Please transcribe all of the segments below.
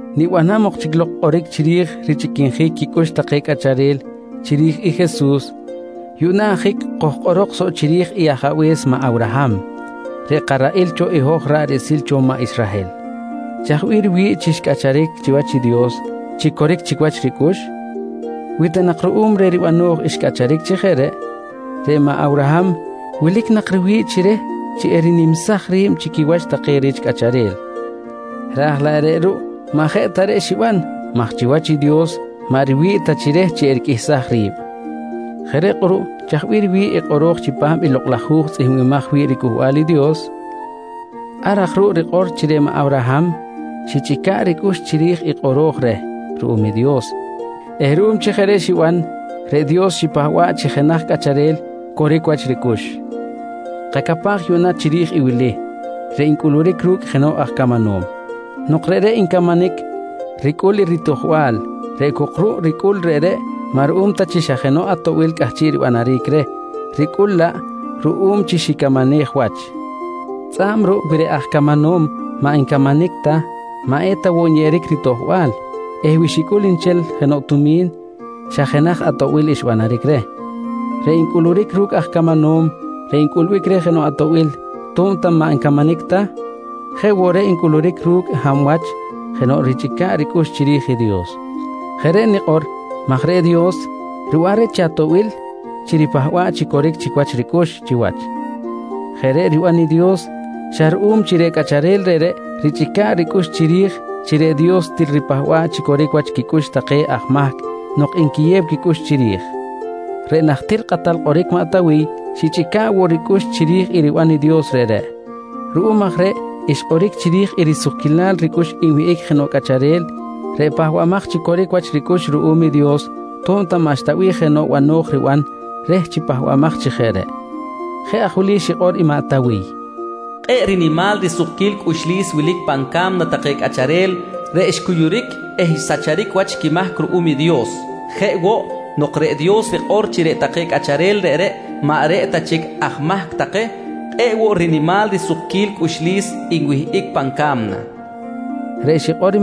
Nibanam ok chic lok kꞌoric chiri̱j richꞌiquinjic quicꞌux take cꞌacharel chiri̱j i Jesus, yuꞌna ajic kojkꞌorok soꞌ chiri̱j i ajabe̱s maꞌ Awraham, reꞌ karaꞌil cho i hoj ra̱ꞌ riꞌsil cho maꞌ Israhel. Chaj bih riwi̱ꞌ chi xcꞌacharic chiwach i Dios chi coric chic wach ricꞌux? Wi ta nak ruꞌum reh ribano̱j xcꞌacharic chi jeꞌ reꞌ, reꞌ maꞌ Awraham wilic nak riwi̱ꞌ chi reh chi erinimsaj ri̱b chi quiwach take rich cꞌacharel. Raj laꞌ maꞌ ruꞌ maꞌ jeꞌ ta reꞌ xiban maj chiwach i Dios maꞌ riwi̱ꞌ ta chi reh chi eriqꞌuihsaj ri̱b. Jeꞌ reꞌ kꞌuruꞌ chaj bih riwi̱ꞌ i kꞌoro̱j chipam i Lokꞌ laj Hu̱j tzꞌihmbimaj wi̱ꞌ riCꞌuhbal i Dios? Ar aj ruꞌ rikꞌor chi reꞌ maꞌ Awraham xichꞌica̱ꞌ ricꞌux chiri̱j i kꞌoro̱j reh ruꞌum i Dios eh chi ruꞌum reꞌ chi jeꞌ xiban, reꞌ Dios xipahba̱ꞌ chi jenaj cꞌacharel coric wach ricꞌux. Kacapaj yuꞌna chiri̱j i wili reꞌ ncꞌuluric ru̱cꞌ jenoꞌ aj camanom: Nok reꞌreꞌ ncamanic, ricꞌul i ritojbal reꞌ cok ruꞌ ricꞌul reꞌreꞌ maꞌ ruꞌum ta chi xa jenoꞌ atoꞌbil cꞌahchiꞌ ribanaric reh, ricꞌul laꞌ ruꞌum chi xicamanej wach. Tzꞌa̱b ruꞌ wi reꞌ aj camanom maꞌ ncamanic ta maꞌ eta woꞌ nyeꞌeric ritojbal eh wi xicꞌul nchel jenoꞌ tumi̱n, xa jenaj atoꞌbil xbanaric reh. Reꞌ ncꞌuluric ru̱cꞌ aj camanom reꞌ ncꞌulbic reh jenoꞌ atoꞌbil to̱b ta maꞌ ncamanic ta, jeꞌ woꞌ reꞌ ncꞌuluric ru̱cꞌ xa hab wach jenoꞌ richꞌica̱ꞌ ricꞌux chiri̱j i Dios. Jeꞌ reꞌ nikꞌor maj reꞌ Dios riban reh chi atoꞌbil chi ripahba̱ꞌ chi coric chic wach ricꞌux chiwach. Jeꞌ reꞌ riban i Dios xa ruꞌum chi reꞌ cꞌacharel reꞌreꞌ richꞌica̱ꞌ ricꞌux chiri̱j chi reꞌ Dios til ripahba̱ꞌ chi coric wach quicꞌux take aj mahc nok nquiyew quicꞌux chiri̱j. Reꞌ najtir kꞌatal kꞌoric maꞌ Tawiy xichꞌica̱ꞌ woꞌ ricꞌux chiri̱j i riban Dios reꞌreꞌ. Ruꞌum aj reꞌ xkꞌoric chiri̱j i risukquilal ricꞌux nwihꞌic jenoꞌ cꞌacharel reꞌ pahbamaj chi coric wach ricꞌux ruꞌum i Dios to̱b ta maꞌxta bih jenoꞌ bano̱j riban reh chi pahbamaj chi jeꞌ reꞌ. Jeꞌ aj wili xikꞌor i maꞌ Tawiy: “Kꞌe̱ꞌ rinimal risukquil cꞌuxlis wilic pan ca̱mna take cꞌacharel reꞌ xcuyuric eh xsacharic wach quimahc ruꞌum i Dios. Jeꞌ woꞌ, nok reꞌ Dios rikꞌor chi reꞌ take cꞌacharel reꞌreꞌ maꞌ reꞌ ta chic aj mahc take, kꞌe̱ꞌ woꞌ rinimal risukquil cꞌuxlis nwihꞌic pan ca̱mna, nqui xikꞌor.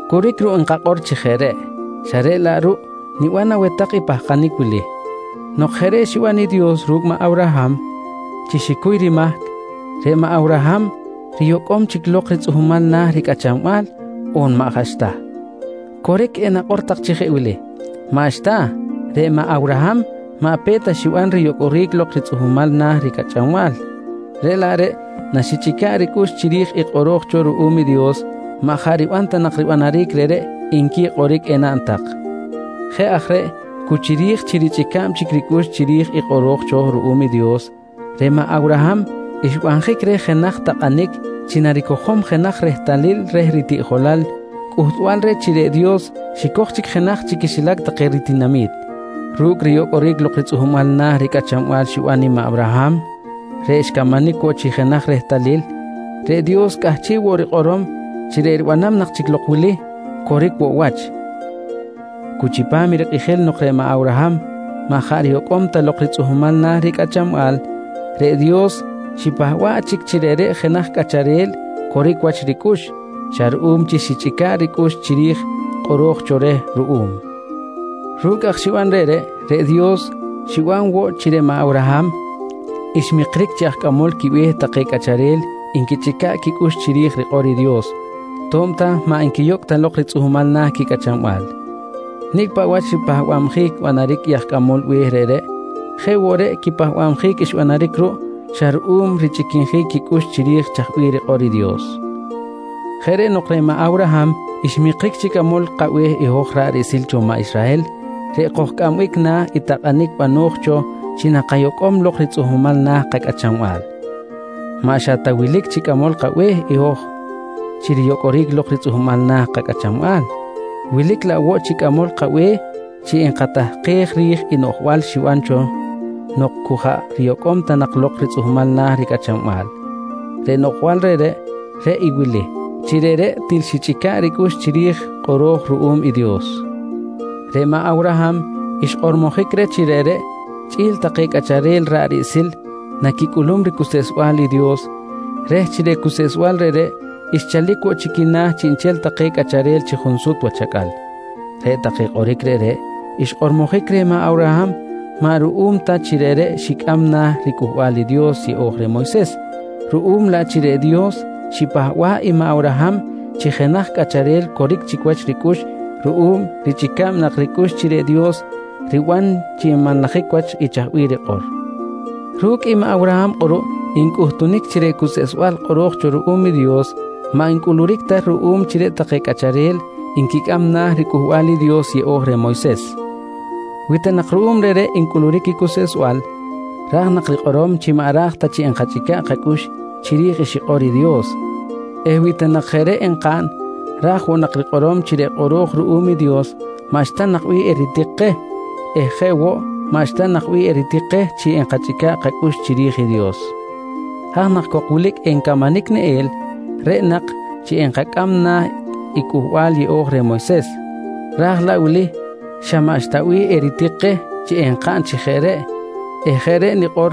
Coric ruꞌ nkakꞌor chi jeꞌ reꞌ, xa reꞌ laꞌ ruꞌ niban aweh tak i pahkanic wili: Nok jeꞌ reꞌ xiban i Dios ru̱cꞌ maꞌ Awraham chi xicuy rimahc, reꞌ maꞌ Awraham riyocꞌom chic lok ritzꞌuhmal na̱ ricꞌachanbal on maꞌ jaꞌ xta? Coric enakꞌor tak chi jeꞌ wili: «Maꞌxta, reꞌ maꞌ Awraham maꞌ pe̱t ta xiban riyocꞌoric lok ritzꞌuhmal na̱ ricꞌachanbal, reꞌ laꞌ reꞌ naxichꞌica̱ꞌ ricꞌux chiri̱j i kꞌoro̱j cho ruꞌum i Dios maꞌ jaꞌ riban ta nak ribanaric reꞌreꞌ, nqui kꞌoric enaꞌn tak. Jeꞌ aj reꞌ cu chiri̱j chi richꞌica̱b chic ricꞌux chiri̱j i kꞌoro̱j cho ruꞌum i Dios, reꞌ maꞌ Awraham xbanjic reh jenaj takꞌanic chi naricojom jenaj rehtalil reh ritiꞌjolal cꞌuhtbal reh chi reꞌ Dios xicoj chic jenaj chi quixilac take ritinami̱t. Ru̱cꞌ riyocꞌoric lok ritzꞌuhmal na̱ ricꞌachanbal xiban i maꞌ Awraham reꞌ xcamanic woꞌ chi jenaj rehtalil, reꞌ Dios cꞌahchiꞌ woꞌ rikꞌorom chi reꞌ ribanam nak chic lok wili coric woꞌ wach: Cu chipam i rikꞌijil nok reꞌ maꞌ Awraham maꞌ jaꞌ riyocꞌom ta lok ritzꞌuhmal na̱ ricꞌachanbal, reꞌ Dios xipahba̱ꞌ chic chi reꞌreꞌ jenaj cꞌacharel coric wach ricꞌux xa ruꞌum chi xichꞌica̱ꞌ ricꞌux chiri̱j kꞌoro̱j cho reh ruꞌum. Ru̱cꞌ aj xiban reꞌreꞌ, reꞌ Dios xiban woꞌ chi reꞌ maꞌ Awraham xmikric chi aj cꞌamol quibe̱h take cꞌacharel nquichꞌica̱ꞌ quicꞌux chiri̱j i rikꞌor i Dios to̱b ta maꞌ nquiyocꞌ ta lok ritzꞌuhmal na̱ quicꞌachanbal. Nicꞌ paꞌ wach ripahba̱bjic banaric i aj cꞌamol quibe̱h reꞌreꞌ jeꞌ woꞌ reꞌ quipahbabjic xbanaric ruꞌ xa ruꞌum richꞌiquinjic quicꞌux chiri̱j chaj bih rikꞌor i Dios. Jeꞌ reꞌ nok reꞌ maꞌ Awraham xmikric chi cꞌamol kabe̱h i hoj ra̱ꞌ riꞌsil cho maꞌ Israhel reꞌ kojcꞌambic na̱ i takꞌanic bano̱j cho chi nakayocꞌom lok ritzꞌuhmal na̱ kacꞌachanbal. Maꞌ xa ta wilic chi cꞌamol kabe̱h i hoj chi riyocꞌoric lok ritzꞌuhmal na̱ kacꞌachanbal, wilic laꞌ woꞌ chi cꞌamol kabe̱h chi nkatahkej ri̱j i noꞌjbal xiban cho nok cu jaꞌ riyocꞌom ta nak lok ritzꞌuhmal na̱ ricꞌachanbal. Reꞌ noꞌjbal reꞌ, reꞌ i wili: Chi reꞌreꞌ til xichꞌica̱ꞌ ricꞌux chiri̱j kꞌoro̱j ruꞌum i Dios. Reꞌ maꞌ Awraham xkꞌormojic reh chi reꞌreꞌ chꞌi̱l take cꞌacharel ra̱ꞌ riꞌsil naquicꞌulum ricuseꞌsbal i Dios reh chi reꞌ cuseꞌsbal reꞌreꞌ xchalic woꞌ chi quina̱ i chiꞌnchel take cꞌacharel chi junsut wach acꞌal. Reꞌ take kꞌoric reꞌreꞌ xkꞌormojic reh maꞌ Awraham maꞌ ruꞌum ta chi reꞌreꞌ xicꞌam na̱ riCꞌuhbal i Dios Yeꞌo̱j reh Moyses, ruꞌum laꞌ chi reꞌ Dios xipahba̱ꞌ i maꞌ Awraham chi jenaj cꞌacharel coric chic wach ricꞌux ruꞌum richꞌica̱b nak ricꞌux chi reꞌ Dios riban chi nmanlajic wach i chaj bih rikꞌor. Ru̱cꞌ i maꞌ Awraham kꞌuruꞌ ncꞌuhtunic chi reꞌ cuseꞌsbal kꞌoro̱j cho ruꞌum i Dios maꞌ ncꞌuluric ta ruꞌum chi reꞌ take cꞌacharel nquicꞌam na̱ i riCꞌuhbal i Dios Yeꞌo̱j reh Moyses. Wi ta nak ruꞌum reꞌreꞌ ncꞌuluric i cuseꞌsbal, ra̱j nak rikꞌorom chi maꞌ eta raj chi nkachꞌica̱ꞌ kacꞌux chiri̱j i xikꞌor i Dios eh wi ta nak jeꞌ reꞌ enkaꞌn ra̱j woꞌ nak rikꞌorom chi reꞌ kꞌoro̱j ruꞌum i Dios maꞌxta nak bih eritik keh eh jeꞌ woꞌ maꞌxta nak bih eritik keh chi nkachꞌica̱ꞌ kacꞌux chiri̱j i Dios. Haj nak cok wilic encamanic neꞌel reꞌ nak chi enkacꞌam na̱ i Cꞌuhbal Yeꞌo̱j reh Moyses, ra̱j wili xa maꞌxta bih eritik keh chi enkaꞌn chi jeꞌ reꞌ eh jeꞌ reꞌ nikꞌor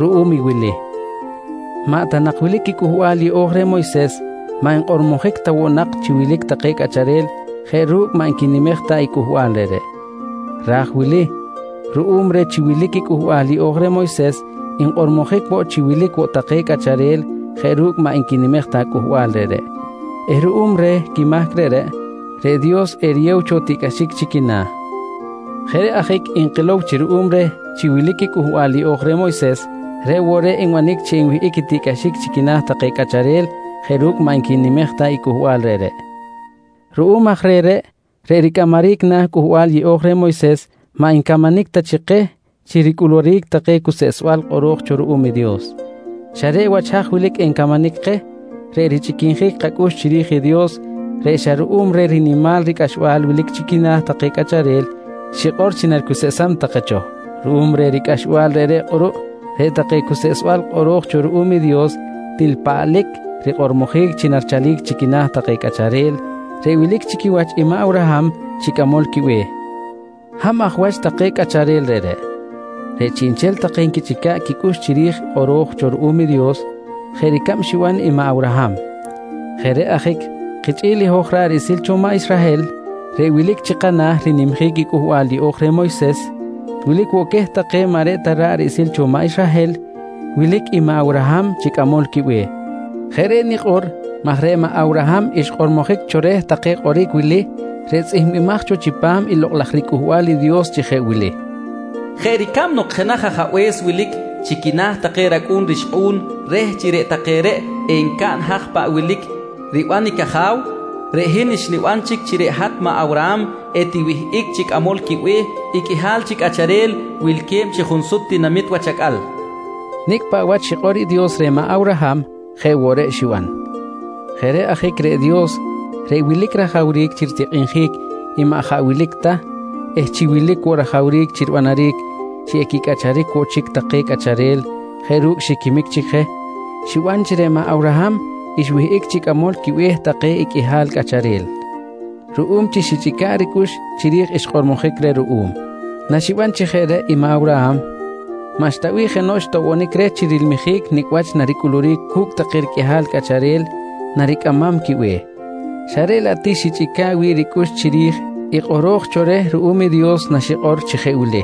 ruꞌum i wili: Maꞌ ta nak wilic i Cꞌuhbal Yeꞌo̱j reh Moyses, maꞌ nkꞌormojic ta woꞌ nak chi wilic take cꞌacharel jeꞌ ru̱cꞌ maꞌ nquinimej ta i cꞌuhbal reꞌreꞌ. Raj wili ruꞌum reh chi wilic i Cꞌuhbal Yeꞌo̱j reh Moyses, nkꞌormojic woꞌ chi wilic woꞌ take cꞌacharel jeꞌ ru̱cꞌ maꞌ nquinimej ta i cꞌuhbal reꞌreꞌ eh ruꞌum reh quimahc reꞌreꞌ, reꞌ Dios eriyew cho tiꞌcꞌaxic chi quina̱. Jeꞌ reꞌ ajic nkilow chi ruꞌum reh chi wilic i Cꞌuhbal Yeꞌo̱j reh Moyses, reꞌ woꞌ reꞌ nbanic chi enwihꞌic i tiꞌcꞌaxic chi quina̱ take cꞌacharel jeꞌ ru̱cꞌ maꞌ nquinimej ta i cꞌuhbal reꞌreꞌ. Ruꞌum aj reh reꞌ, reꞌ ricꞌamaric na̱ i Cꞌuhbal Yeꞌo̱j reh Moyses maꞌ ncamanic ta keh chi ricꞌuluric take cuseꞌsbal kꞌoro̱j cho ruꞌum i Dios. Xa reꞌ wach haj wilic encamanic keh, reꞌ richꞌiquinjic kacꞌux chiri̱j i Dios reꞌ xa ruꞌum reh rinimal ricꞌaxbal wilic chi quina̱ take cꞌacharel xikꞌor chi naricuseꞌsam take cho. Ruꞌum reh ricꞌaxbal reꞌreꞌ kꞌuruꞌ, reꞌ take cuseꞌsbal kꞌoro̱j cho ruꞌum i Dios til paꞌlic rikꞌormojic chi narichalic chi quina̱ take cꞌacharel reꞌ wilic chi quiwach i maꞌ Awraham chi cꞌamol quibe̱h. Hab aj wach take cꞌacharel reꞌreꞌ? Reꞌ chiꞌnchel take nquichꞌica̱ꞌ quicꞌux chiri̱j i kꞌoro̱j cho ruꞌum i Dios jeꞌ ricab xiban i maꞌ Awraham. Jeꞌ reꞌ ajic kichꞌi̱l i hoj ra̱ꞌ riꞌsil cho maꞌ Israhel reꞌ wilic chi kana̱ rinimjic i Cꞌuhbal Yeꞌo̱j reh Moyses, wilic woꞌ queh take maꞌ reꞌ ta ra̱ꞌ riꞌsil cho maꞌ Israhel wilic i maꞌ Awraham chi cꞌamol quibe̱h. Jeꞌ reꞌ nikꞌor maj reꞌ maꞌ Awraham xkꞌormojic cho reh take kꞌoric wili reꞌ wilque̱b woꞌ chi tzꞌihmbimaj cho chipam i Lokꞌ laj riCꞌuhbal i Dios chi jeꞌ wili: “Jeꞌ ricab nok jenaj ajabe̱s wilic chi quina̱ take racꞌu̱n rixkꞌu̱n reh chi reꞌ take reꞌ encaꞌn haj paꞌ wilic riban i caja̱w, reꞌ hin xniban chic chi reꞌ hat maꞌ Awraham etiwihꞌic chi cꞌamol quibe̱h i qꞌuihal chi cꞌacharel wilque̱b chi junsut tinamit wach acꞌal, nqui xkꞌormojic reh. Nicꞌ paꞌ wach xikꞌor i Dios reh Awraham jeꞌ woꞌ reꞌ xiban. Jeꞌ reꞌ ajic reꞌ Dios reꞌ wilic rajawric chi ritikꞌinjic i maꞌ jaꞌ wilic ta eh chi wilic woꞌ rajawric chi ribanaric chi equicꞌacharic woꞌ chic take cꞌacharel jeꞌ ru̱cꞌ xiquimic chic je, xiban chi reꞌ maꞌ Awraham xwihꞌic chi cꞌamol quibe̱h take i qꞌuihal cꞌacharel ruꞌum chi xichꞌica̱ꞌ ricꞌux chiri̱j xkꞌormojic reh ruꞌum. Naxiban chi jeꞌ reꞌ i Awraham, maꞌxta bih jenoꞌ xtoꞌbonic reh chi rilmijic nicꞌ wach naricꞌuluric cu̱cꞌ take riqꞌuihal cꞌacharel naricꞌamam quibe̱h, xa reꞌ laꞌ ti xichꞌica̱ꞌ wi̱ꞌ ricꞌux chiri̱j i kꞌoro̱j cho reh ruꞌum i Dios naxikꞌor chi jeꞌ wili: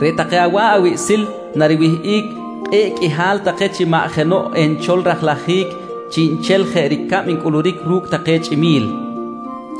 “Reꞌ take awa̱ꞌ awiꞌsil nariwihꞌic kꞌe̱ꞌ qꞌuihal take chi maꞌ jenoꞌ enchol rajlajic chiꞌnchel jeꞌ ricab ncꞌuluric ru̱cꞌ take chꞌimi̱l, nqui xikꞌor reh.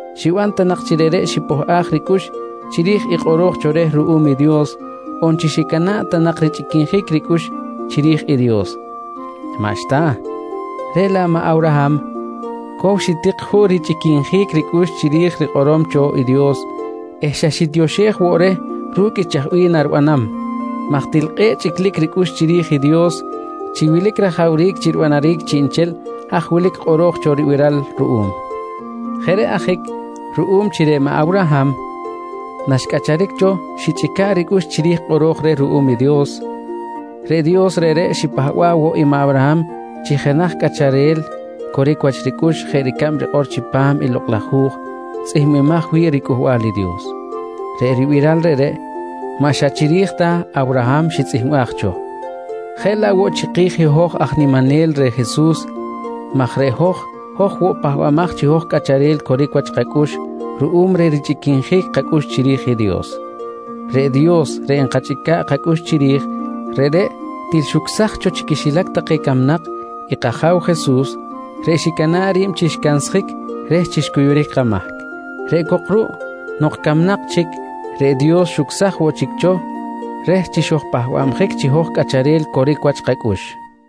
xiban ta nak chi reꞌreꞌ xipohꞌaj ricꞌux chiri̱j i kꞌoro̱j cho reh ruꞌum i Dios on chi xicana̱ꞌ ta nak richꞌiquinjic ricꞌux chiri̱j i Dios. Maꞌxta! Reꞌ laꞌ maꞌ Awraham cow xitik juꞌ richꞌiquinjic ricꞌux chiri̱j rikꞌorom cho i Dios eh xa xitioxej woꞌ reh ru̱cꞌ i chaj bih naribanam maj til kꞌe̱ꞌ chꞌiclic ricꞌux chiri̱j i Dios chi wilic rajawric chi ribanaric chiꞌnchel haj wilic kꞌoro̱j cho ribiral ruꞌum. Jeꞌ reꞌ ajic ruꞌum chi reꞌ maꞌ Awraham naxcꞌacharic cho xichꞌica̱ꞌ ricꞌux chiri̱j i kꞌoro̱j reh ruꞌum i Dios, reꞌ Dios reꞌreꞌ xipahba̱ꞌ woꞌ i maꞌ Awraham chi jenaj cꞌacharel coric wach ricꞌux jeꞌ ricab rikꞌor chipam i Lokꞌ laj Hu̱j tzꞌihmbimaj wi̱ꞌ riCꞌuhbal i Dios. Reꞌ ribiral reꞌreꞌ maꞌ xa chiri̱j ta Awraham tzꞌihmbimaj cho, jeꞌ laꞌ woꞌ chiki̱j hoj aj niminel reh Jesus maj reꞌ hoj, hoj woꞌ pahbamaj chi hoj cꞌacharel coric wach kacꞌux ruꞌum reh richꞌiquinjic kacꞌux chiri̱j i Dios. Reꞌ Dios reꞌ nkachꞌica̱ꞌ kacꞌux chiri̱j reꞌreꞌ til xucsaj cho chi quixilac take camnak i kAja̱w Jesus reꞌ xicana̱ꞌ ri̱b chi xcansjic reh chi xcuyuric kamahc. Reꞌ cok ruꞌ nok camnak chic, reꞌ Dios xucsaj woꞌ chic cho reh chi xojpahbabjic chi hoj cꞌacharel coric wach kacꞌux.